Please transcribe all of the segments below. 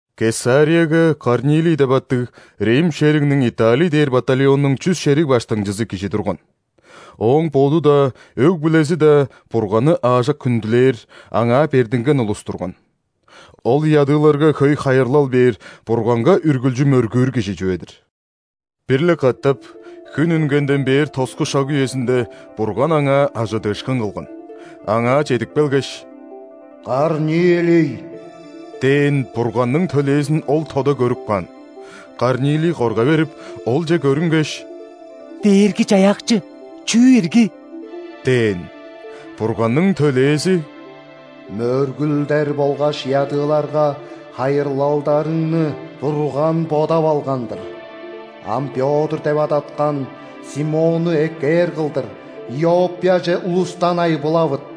Кесарияга Корнилий деп аттыг, рим шеригниң Италий дээр батальоннуң чүс шериг баштыңчызы кижи турган. Ооң боду-даа, өг-бүлези-даа Бурганны аажок хүндүлээр, Аңаа бердинген улус турган. Ол ядыыларга хөй хайырлал бээр, Бурганга үргүлчү мөргүүр кижи чүве-дир. Бир-ле катап, хүн үнгенден бээр тоску шак үезинде, Бурган аңаа ·ажыдыышкын кылган. Аңаа чедип келгеш: «Корнилий!» – дээн Бурганның төлээзин ол тода көрүп каан. Корнилий корга берип, олче көрүнгеш: «Дээрги-Чаяакчы, чүү ирги?» – дээн. Бурганның төлээзи: «Мөргүлдер болгаш ядыыларга хайырлалдарыңны Бурган бодап алган-дыр. Ам Пётр деп адаткан Симонну эккээр кылдыр Иоппияже улустан айбылавыт.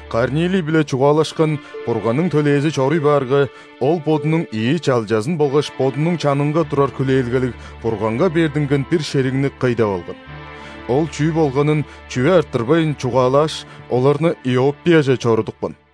Корнилий-биле чугаалашкан Бурганның төлээзи чоруй баарга, ол бодунуң ийи чалчазын болгаш бодунуң чанынга турар хүлээлгелиг, Бурганга бердинген бир шеригни кый деп алган. Ол чүү болганын, чүве арттырбайн, чугаалааш, оларны Иоппияже чорудупкан.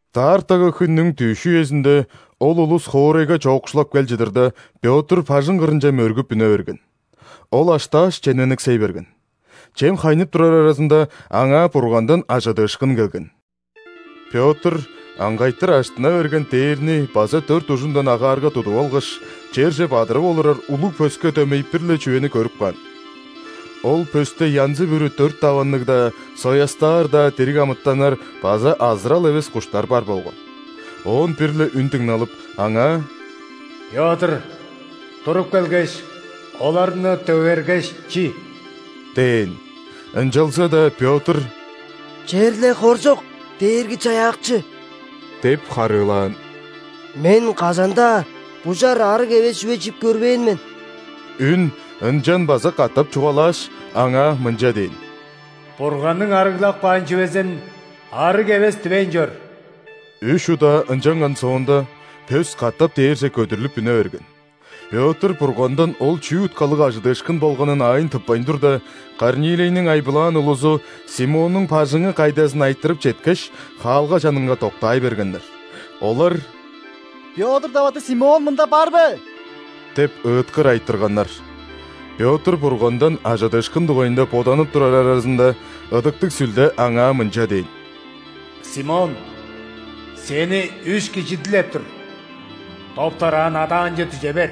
Даартагы хүннүң дүъш үезинде, ол улус хоорайга чоокшулап кел чыдырда, Пётр бажың кырынче мөргүп үне берген. Ол аштааш, чемнениксей берген. Чем хайнып турар аразында, аңаа Бургандан ·ажыдыышкын келген. Пётр аңгайтыр ажыттына берген дээрни база дөрт ужундан агаарга тудуп алгаш, черже бадырып олурар улуг пөске дөмей бир-ле чүвени көрүп каан. Ол пөсте янзы-бүрү дөрт даванныг-даа, соястаар-даа дириг амытаннар база азырал эвес куштар бар болган. Оон бир-ле үн дыңналып, аңаа: «Пётр, туруп келгеш, оларны дөгергеш, чи» – дээн. Ынчалза-даа Пётр: «Черле хоржок, Дээрги-Чаяакчы! – деп харыылаан. – Мен кажан-даа бужар, ·арыг эвес чүве чип көрбээн мен». Үн ынчан база катап чугаалааш, аңаа мынча дээн: «Бурганның арыглап каан чүвезин арыг эвес дивейн чор». Үш удаа ынчанган соонда, пөс катап дээрже көдүрлүп үне берген. Пётр Бургандан ол чүү уткалыг ажыдыышкын болганын аайын тыппайн турда, Корнилийниң айбылаан улузу Симоннуң бажыңы кайдазын айтырып четкеш, хаалга чанынга доктаай бергеннер. Олар: «Пётр деп аттыг Симон мында бар бе?» – деп ыыткыр айтырганнар. Пётр Бургандан ажыдыышкын дугайында боданып турар аразында, Ыдыктыг Сүлде аңаа мынча дээн: «Симон, сени үш кижи дилеп тур. Доп-дораан адаанче дүже бер.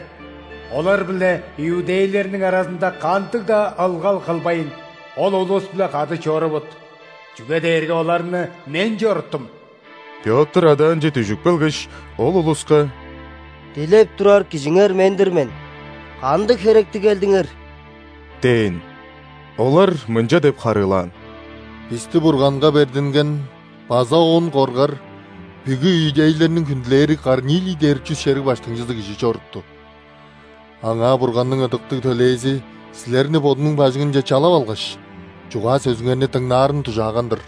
Олар биле иудейлерниң аразында кандыг-даа ылгал кылбайн, ол улус-биле кады чорувут, чүге дээрге оларны Мен чоруттум». Пётр адаанче дүжүп келгеш, ол улуска: «Дилеп турар кижиңер мен-дир мен. Кандыг херектиг келдиңер?» – дээн. Олар мынча деп харыылаан: «Бисти Бурганга бердинген база Оон коргар, бүгү иудейлерниң хүндүлээри Корнилий дээр чүс шериг баштыңчызы кижи чорутту. Аңаа Бурганның ыдыктыг төлээзи силерни бодунуң бажыңынче чалап алгаш, чугаа-сөзүңерни дыңнаарын дужааган-дыр».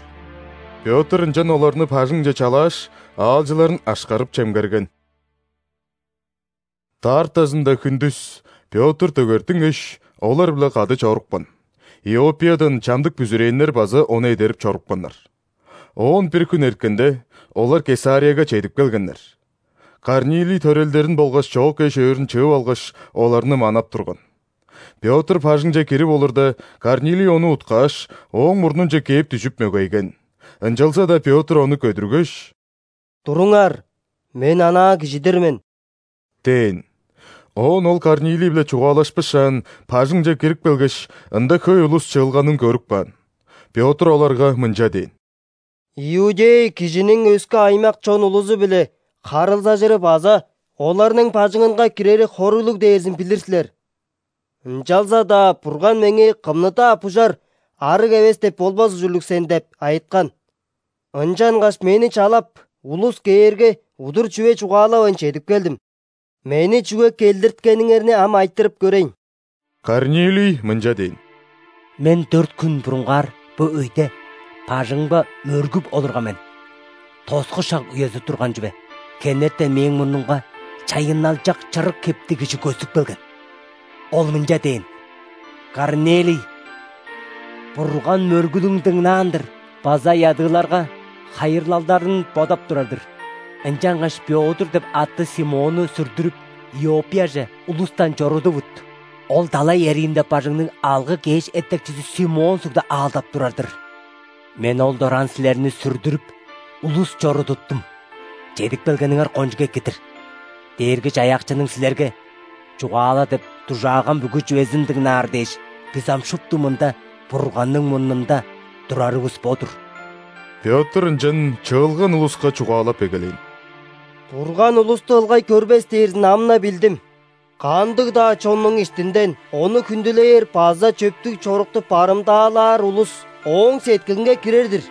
Пётр ынчан оларны бажыңче чалааш, аалчыларын ашкарып-чемгерген. Даартазында хүндүс Пётр дөгертингеш, олар-биле кады чорупкан, Иоппиядан чамдык бүзүрээннер база ону эдерип чорупканнар. Оон бир хүн эрткенде, олар Кесарияга чедип келгеннер. Корнилий төрелдерин болгаш чоок эш-өөрүн чыып алгаш, оларны манап турган. Пётр бажыңче кирип олурда, Корнилий ону уткааш, ооң мурнунче кээп дүжүп, мөгейген. Ынчалза-даа Пётр ону көдүргеш: «Туруңар! Мен анаа кижи-дир мен» – дээн. Оон ол Корнилий-биле чугаалашпышаан, бажыңче кирип келгеш, ында хөй улус чыылганын көрүп каан. Пётр оларга мынча дээн: «Иудей кижиниң өске аймак-чон улузу-биле харылзажыры база оларның бажыңынга кирери хоруглуг дээрзин билир силер. Ынчалза-даа Бурган меңээ „Кымны-даа бужар, арыг эвес деп болбас ужурлуг сен“ деп айыткан. Ынчангаш мени чалап, улус кээрге, удур чүве чугаалавайн, чедип келдим. Мени чүге келдирткениңерни ам айтырып көрейн». Корнилий мынча дээн: «Мен дөрт хүн бурунгаар, бо өйде, бажыңымга мөргүп олурган мен, тоску шак үези турган чүве. Хенертен мээң мурнумга чайынналчак чырык хептиг кижи көстүп келген. Ол мынча дээн: „Корнилий, Бурган мөргүлүң дыңнаан-дыр база ядыыларга хайырлалдарың бодап турар-дыр. Ынчангаш Пётр деп аттыг Симонну сүрдүрүп, Иоппияже улустан чорудувут. Ол далай эриинде бажыңныг алгы-кеш эттекчизи Симон сугда аалдап турар-дыр“. Мен ол дораан силерни сүрдүрүп, улус чорудуптум, чедип келгениңер кончуг эки-дир. Дээрги-Чаяакчының силерге: „Чугаала“ – деп дужааган бүгү чүвезин дыңнаар дээш, бис ам шупту мында, Бурганның мурнунда турарывыс бо-дур». Пётр ынчан чыылган улуска чугаалап эгелээн: «Бурган улусту ылгай көрбес дээрзин ам-на билдим. Кандыг-даа чоннуң иштинден Ону хүндүлээр база чөптүг чорукту барымдаалаар улус Ооң сеткилинге кирер-дир.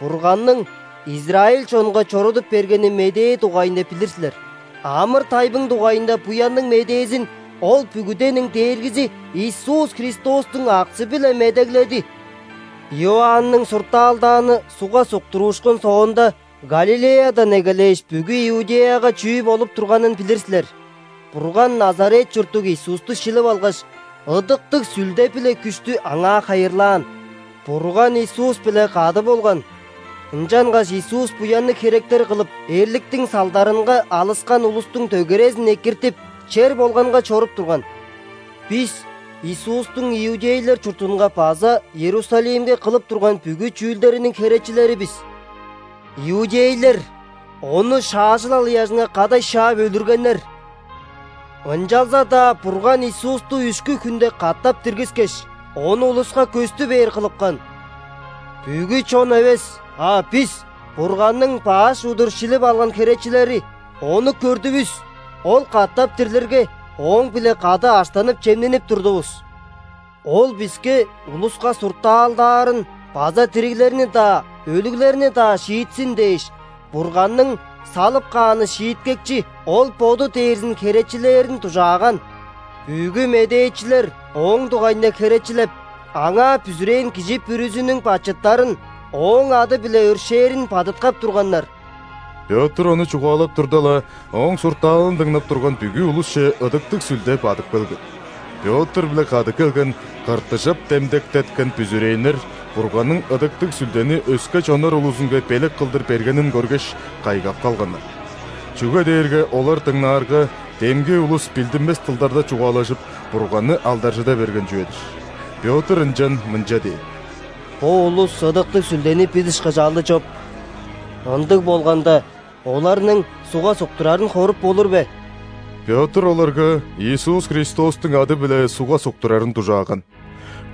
Бурганның израиль чонга чорудуп бергени медээ дугайында билир силер. Амыр-тайбың дугайында Буянныг Медээзин Ол бүгүдениң Дээргизи Иисус Христостуң аксы-биле медегледи. Иоанның суртаалдааны ·сугга суктуруушкун соонда, Галилеядан эгелээш, бүгү Иудеяга чүү болуп турганын билир силер. Бурган Назарет чурттуг Иисусту шилип алгаш, Ыдыктыг Сүлде биле күштү Аңаа хайырлаан. Бурган Иисус-биле кады болган, ынчангаш Иисус буянныг херектер кылып, эрликтиң салдарынга алыскан улустуң дөгерезин экиртип, чер болганга чоруп турган. Бис Иисустуң иудейлер чуртунга база Иерусалимге кылып турган бүгү чүүлдериниң херечилери бис. Иудейлер Ону шаажылал ыяжынга кадай шаап өлүргеннер. Ынчалза-даа Бурган Иисусту үшкү хүнде катап диргискеш, Ону улуска көстү бээр кылыпкан. Бүгү чон эвес, а бис, Бурганның баш удур шилип алган херечилери, Ону көрдүвүс. Ол катап дирлирге, Ооң-биле кады аштанып-чемненип турдувус. Ол биске улуска суртаалдаарын база дириглерни-даа, өлүглерни-даа шиитсин дээш, Бурганның салып кааны шииткекчи – Ол Боду дээрзин херечилээрин дужааган. Бүгү медээчилер Ооң дугайында херечилеп, Аңаа бүзүрээн кижи бүрүзүнүң бачыттарын Ооң ады-биле өршээрин бадыткап турганнар». Пётр ону чугаалап турда-ла, ооң суртаалын дыңнап турган бүгү улусче Ыдыктыг Сүлде бадып келген. Пётр-биле кады келген ·кыртыжап демдектеткен бүзүрээннер Бурганның Ыдыктыг Сүлдени өске чоннар улузунга белек кылдыр бергенин көргеш, кайгап калганнар. Чүге дээрге олар дыңнаарга, демги улус билдинмес дылдарда чугаалажып, Бурганны алдаржыда берген чүве-дир. Пётр ынчан мынча дээн: «Бо улус Ыдыктыг Сүлдени бис ышкаш алды чоп! Ындыг болганда, оларның ·сугга суктурарын хоруп болур бе?» Пётр оларга Иисус Христостуң ады-биле сугга суктурарын дужааган.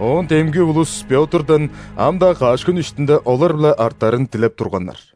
Оон демги улус Пётрдан ам-даа каш хүн иштинде олар-биле артарын дилеп турганнар.